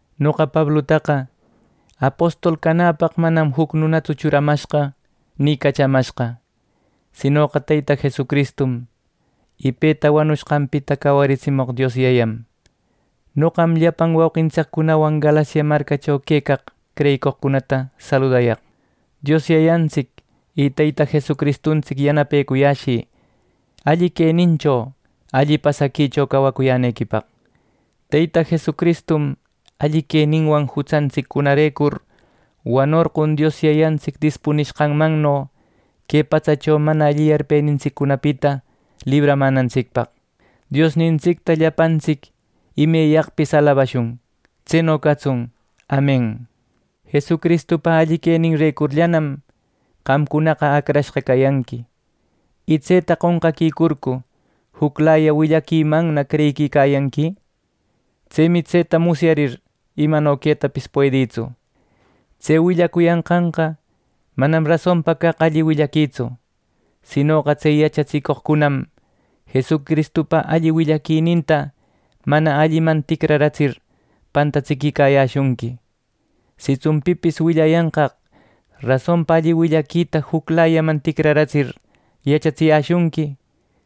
Noqa Pablutaqa, apostol canäpaq, manam juc nunatsu churamashqa, ni cachamashqa, sinoqa Teyta Jesucristum, y peta wanushqanpita cawariratsimoq Dios Yayam. Noqam, llapan wauqintsiccunawan Galacia marcacho quecaq creyicoqcunata saludayaq. Dios Yayantsic y Teyta Jesucristuntsic yanapecuyäshï alli quenincho, alli pasaquicho cawacuyänequipaq. Teyta Jesucristum alli queninwan jutsantsiccunarecur wanorqon Dios Yayantsic dispunishqanmanno, que patsacho mana alli yarpenintsiccunapita libramänantsicpaq. ¡Diosnintsicta llapantsic imeyaqpis alabashun! ¡Tseno catsun! ¡Amen! Jesucristupa alli queninrecurllanam qamcunaqa acrashqa cayanqui. ¿Y tseta qonqaquicurcu juclaya willaquimanna creyiquicayanqui! Tsemi tseta musyarir imano quetapis puedïtsu. Tse willacuyanqanqa manam rasonpa caq alli willaquitsu. Sinoqa tse yachatsicoqcunam Jesucristupa alli willaquininta mana alliman ticraratsir pantatsiquicayäshunqui. Sitsun pipis willayanqaq rasonpa alli willaquita juclayaman ticraratsir, yachatsiyäshunqui;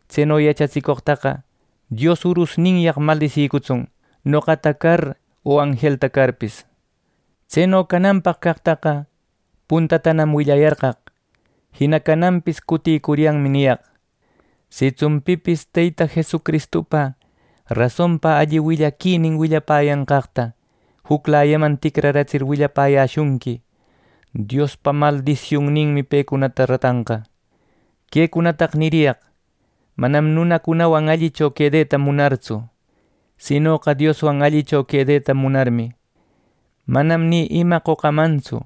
tseno yachatsicoqtaqa Dios urusninyaq maldisicutsun, noqata car o anjelta carpis. Tseno cananpaq caqtaqa puntatanam willayarqaq, jina cananpis cutïcuryanmi niyaq: Sitsun pipis Teyta Jesucristupa rasonpa alli willaquinin willapäyanqaqta juclayaman ticraratsir willapäyäshunqui, Diospa maldisiunninmi pecunata ratanqa. Quecunataqa niriyaq manam nunacunawan allicho quedeta munartsu; sinoqa Dioswan allicho quedeta munarmi. Manam ni ima qocamantsu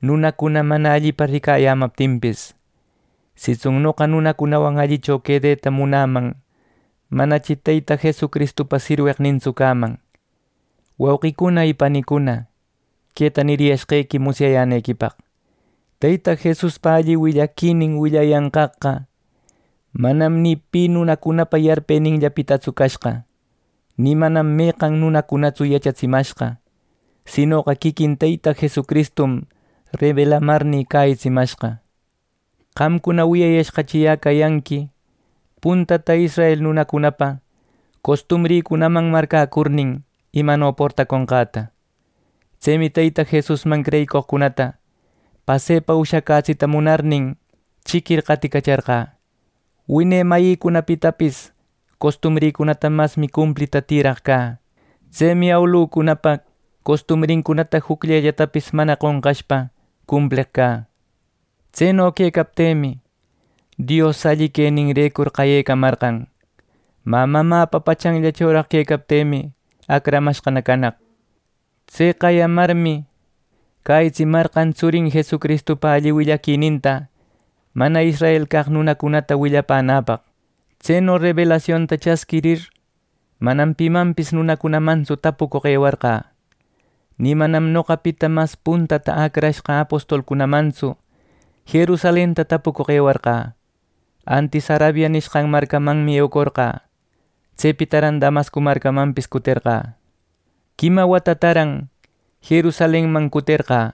nunacuna mana allipa ricayämaptinpis. Sitsun noqa nunacunawan allicho quedeta munäman, manachi Teyta Jesucristupa sirweqnintsu cäman. Wauqicuna y panicuna, queta niriyashqequi musyayänequipaq: Teyta Jesuspa alli willaquinin willayanqaqqa manam ni pi nunacunapa yarpeninllapitatsu cashqa. Ni manam meqan nunacunatsu yachatsimashqa; sinoqa quiquin Teyta Jesucristum rebelamarnï cäyitsimashqa. Qamcuna wiyayashqachi yä cayanqui puntata israel nunacunapa costumbricunaman marcäcurnin, imano portacunqäta. Tsemi Teyta Jesusman creyicoqcunata pasepa ushacätsita munarnin, chiquir qaticacharqä. Wine mayïcunapitapis costumbrïcunata masmi cumplita tiraq cä. Tsemi awilucunapa costumbrincunata jucllellatapis mana qonqashpa cumpleq cä. Tseno quecaptïmi, Dios alli queninrecur qayecamarqan. Mä mamäpa pachanllachoraq quecaptïmi acramashqana canaq. Tse qayamarmi, cäyitsimarqan tsurin Jesucristupa alli willaquininta mana israel caq nunacunata willapänäpaq. Tseno rebelasionta chasquirir, manam pimanpis nunacunamantsu tapucoq ewarqä. Ni manam noqapita mas puntata acrashqa apostolcunamantsu Jerusalenta tapucoq ewarqä. Antis Arabia nishqan marcamanmi eucorqä. Tsepitaran Damasco marcamanpis cuterqä. Quima watataran Jerusalenman cuterqä,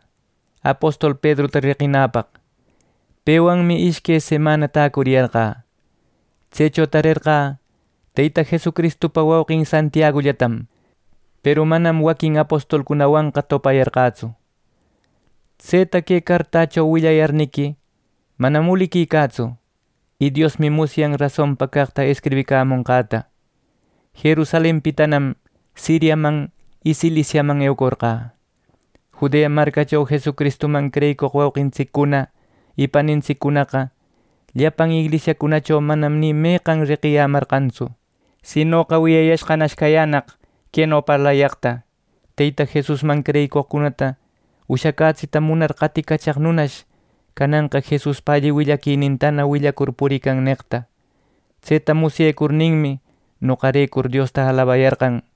apostol Pedruta reqinäpaq. Pewanmi ishque semana täcuriyarqä. Tsecho tarerqä Teyta Jesucristupa wauqin Santiagullatam; peru manam waquin apostolcunawanqa topayarqätsu. Tseta que cartächo willayarniqui, manam uliquicätsu y Diosmi musyan rasonpa caqta escribicamonqäta. Jerusalenpitanam Siriaman y Ciliciaman eucorqä. Judea marcacho Jesucristuman creyicoq wauqintsiccuna y panintsiccunaqa llapan inglisiacunacho manam ni meqan reqiyämarqantsu. Sinoqa wiyayashqanash cayänaq queno parlayaqta: “Teyta Jesusman creyicoqcunata ushacätsita munar qaticachaq nunash, cananqa, Jesuspa alli willaquinintana willacur purican” neqta. Tseta musyecurninmi noqarecur Diosta alabayarqan.